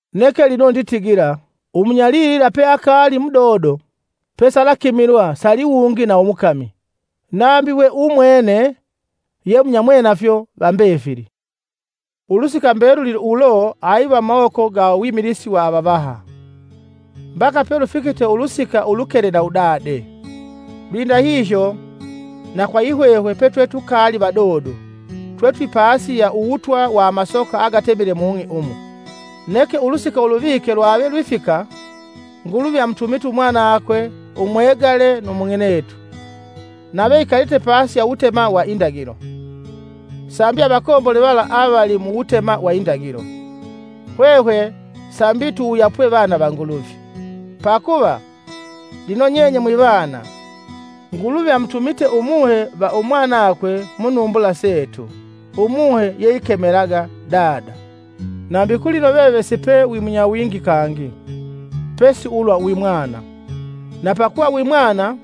Neke lino nditigila; Umunyalilila peakaali mudodo, pesalakimilwa saliwungi na umukami, nambi we umwene ye munyamwenafyo va mbefili. Ulusika mbeluli ulo aiva mumawoko ga uwimilisi wa avavaha, mbaka pelufikite ulusika ulukele na udade. Lwindahihyo, na kwa yihwehwe petwetukaali vadodo, twetwipasi ya uwutwa wa amasoka agatemite mung'i umu. Neke ulusika uluvike lwave lwifika, Nguluvi amutumite Umwanakwe umwegale nu mung'inetu, nave ikalite pasi ya uwutema wa indagilo, sambi avakombole vala avali muwutema wa indagilo, hwehwe sambi tuwuyapwe vana va Nguluvi. Pakuva, lino nyenye mwivana, Nguluvi amutumite Umuhe va Umwanakwe mu numbula setu Umuhe yeikemelaga, “Dada.” Nambi kulino veve sipe wimunywawingi kangi, pesi ulwa wimwana. Na pakuva wimwana,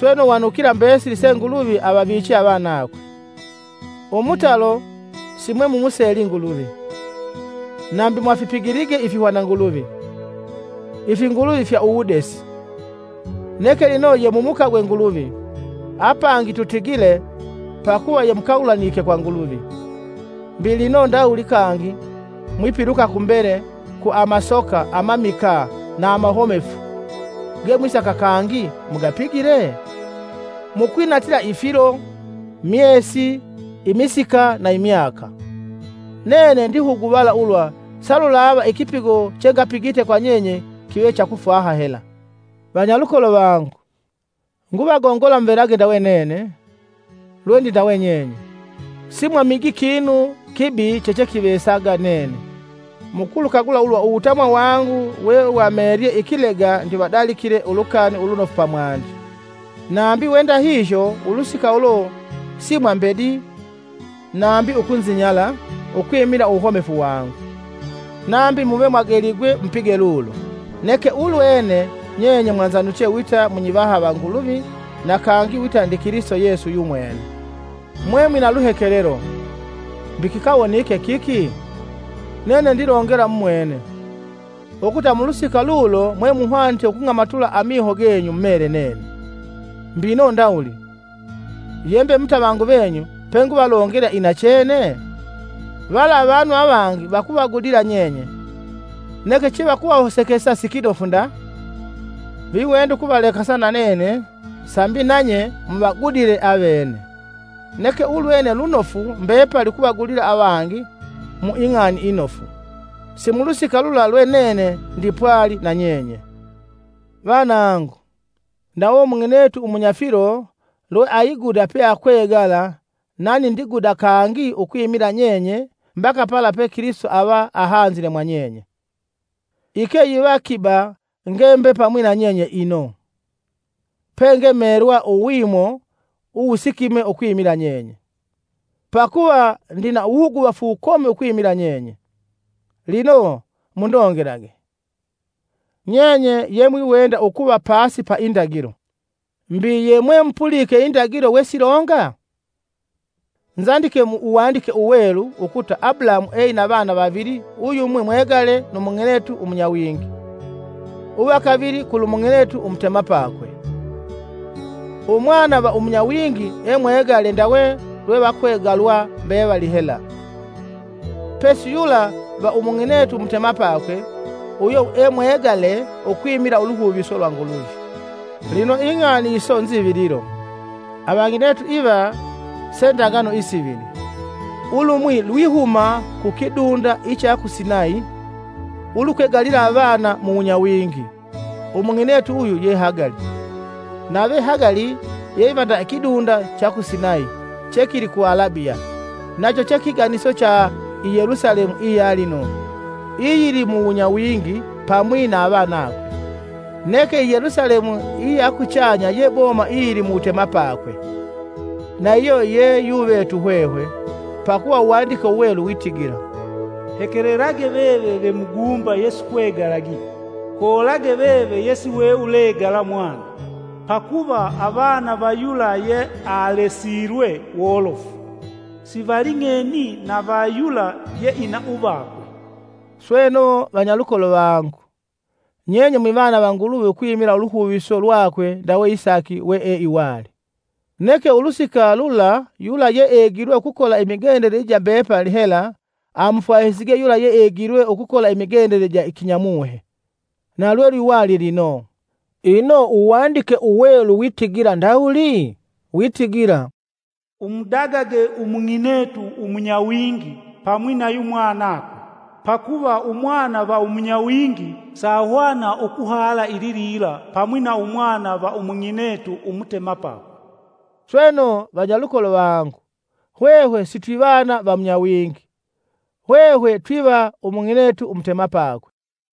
sweno wanukila mbesili se Nguluvi avaviche avanakwe. Umutalo, simwemumuseli Nguluvi, nambi mwafipigilige ifihwananguluvi, ifinguluvi fya uwudesi. Neke lino yemumukagwe Nguluvi, apangi tutigile pakuva yemukagulanike kwa Nguluvi, mbi lino ndawuli kangi mwipiluka kumbele ku amasoka amamikaa na amahomefu ge mwisaka kangi mugapigile? Mukwinatila ifilo, myesi, imisika na imyaka. Nene ndihuguvala ulwa salulava ikipigo chengapigite kwa nyenye kive cha kufwaha hela. Vanyalukolo vangu, nguvagongola muvelage ndawe nene, lwendindawe nyenye. Simwamiji kinu kibi chechekivesaga nene. mukulukagula ulwa uwutamwa wangu wewamelye ikilega ndivadalikile Ulukani Ulunofu pamwandi. Nambi we ndahihyo ulusika ulo simwambedii nambi ukunzinyala ukwimila uwuhomefu wangu, nambi muve mwageligwe mupige lulo, neke ulwene nyenye mwanzanuche wita munyivaha va Nguluvi na kangi wita ndi Kilisito Yesu yumwene. Mwemwina luhekelelo; mbi kikawonike kiki? Nene ndilongela mumwene, ukuta mulusika lulo mwemuhwanite ukung'amatula amiho genyu, mumele nene. Mbino ndawuli! Yembe mutavangu venyu penguvalongela inachene? Vala avanu avangi vakuvagudila nyenye, neke chevakuhosekesa sikinofu nda. Viwenda ukuvalekasa na nene sambi nanye muvagudile avene. Neke ulwene lunofu mbepali ukuvagudila avangi mu ing'ani inofu, si mulusika lula lwe nene ndipwali na nyenye. Vanangu, ndawe umung'inetu umunyafilo lweaiguda peakwegala nani ndiguda kangi ukwimila nyenye mbaka pala pe Kilisito ava ahanzile mwa nyenye. Ike yiva kiba ngembe pamwi na nyenye ino, penge melwa uwimo uwusikime ukwimila nyenye. Pakuva ndina wuhuguvafu wukomi ukwimila nyenye! Lino mundongelage, nyenye yemwiwenda ukuva pasi pa indagilo. Mbi yemwemupulike indagilo wesilonga? Nzandike mu Uwandike Uwelu ukuta Abulahamu eina vana vavili uyumwi mwegale nu umung'inetu umunyawingi, uva kavili kulumung'inetu umutemapakwe. Umwana va umunyawingi emwegale ndawe lwevakwegalwa mbevali hela, pesi yula va umung'inetu umutemapakwe, uyo emwagale ukwimila uluhuviso lwa Nguluvi. Lino ing'ani iso nzivililo: avang'inetu iva se ndagano isivili: Ulumwi lwihuma ku kidunda icha ku Sinayi, ulukwegalila anana mu wunyawingi; umung'inetu uyu ye Hagali, Nave Hagali, yeiva nda ikidunda cha ku Sinayi, chekili ku Alabiya, nacho che kiganiso cha i Yelusalemu iya lino iyilimuwunyawingi pamwi na avanakwe. Neke i Yelusalemu iya kuchanya ye boma iyili mu wutemapakwe, na iyo yeyuvetu hwehwe. Pakuva Uwandike Uwelu witigila: “Hekelelage veve ve muguumba yesukwegalagi, Koolage veve yesiwe ulegala mwana. Pakuva avana va yula yealesilwe wolofu, sivaling'eni na va yula yeina uvakwe.” Sweno, vanyalukolo vangu, nyenye mwivana va Nguluvi ukwimila uluhuviso lwakwe ndawe Isaki weeiwali. Neke ulusika lula yula yeegilwe ukukola imigendele ija mbepali hela amufwahisige yula yeegilwe ukukola imigendele ija kinya muhe, na lwelwiwali lino. Ino Uwandike Uwelu witigila ndawuli? witigila, “Umudagage umung'inetu umunyawingi pamwi na yumwanakwe, pakuva umwana va umunyawingi sahwana ukuhala ililila pamwi na umwana va umung'inetu umutemapakwe.” Sweno vanyalukolo vangu hwehwe sitwivana va munyawingi, hwehwe twiva umung'inetu umutemapakwe.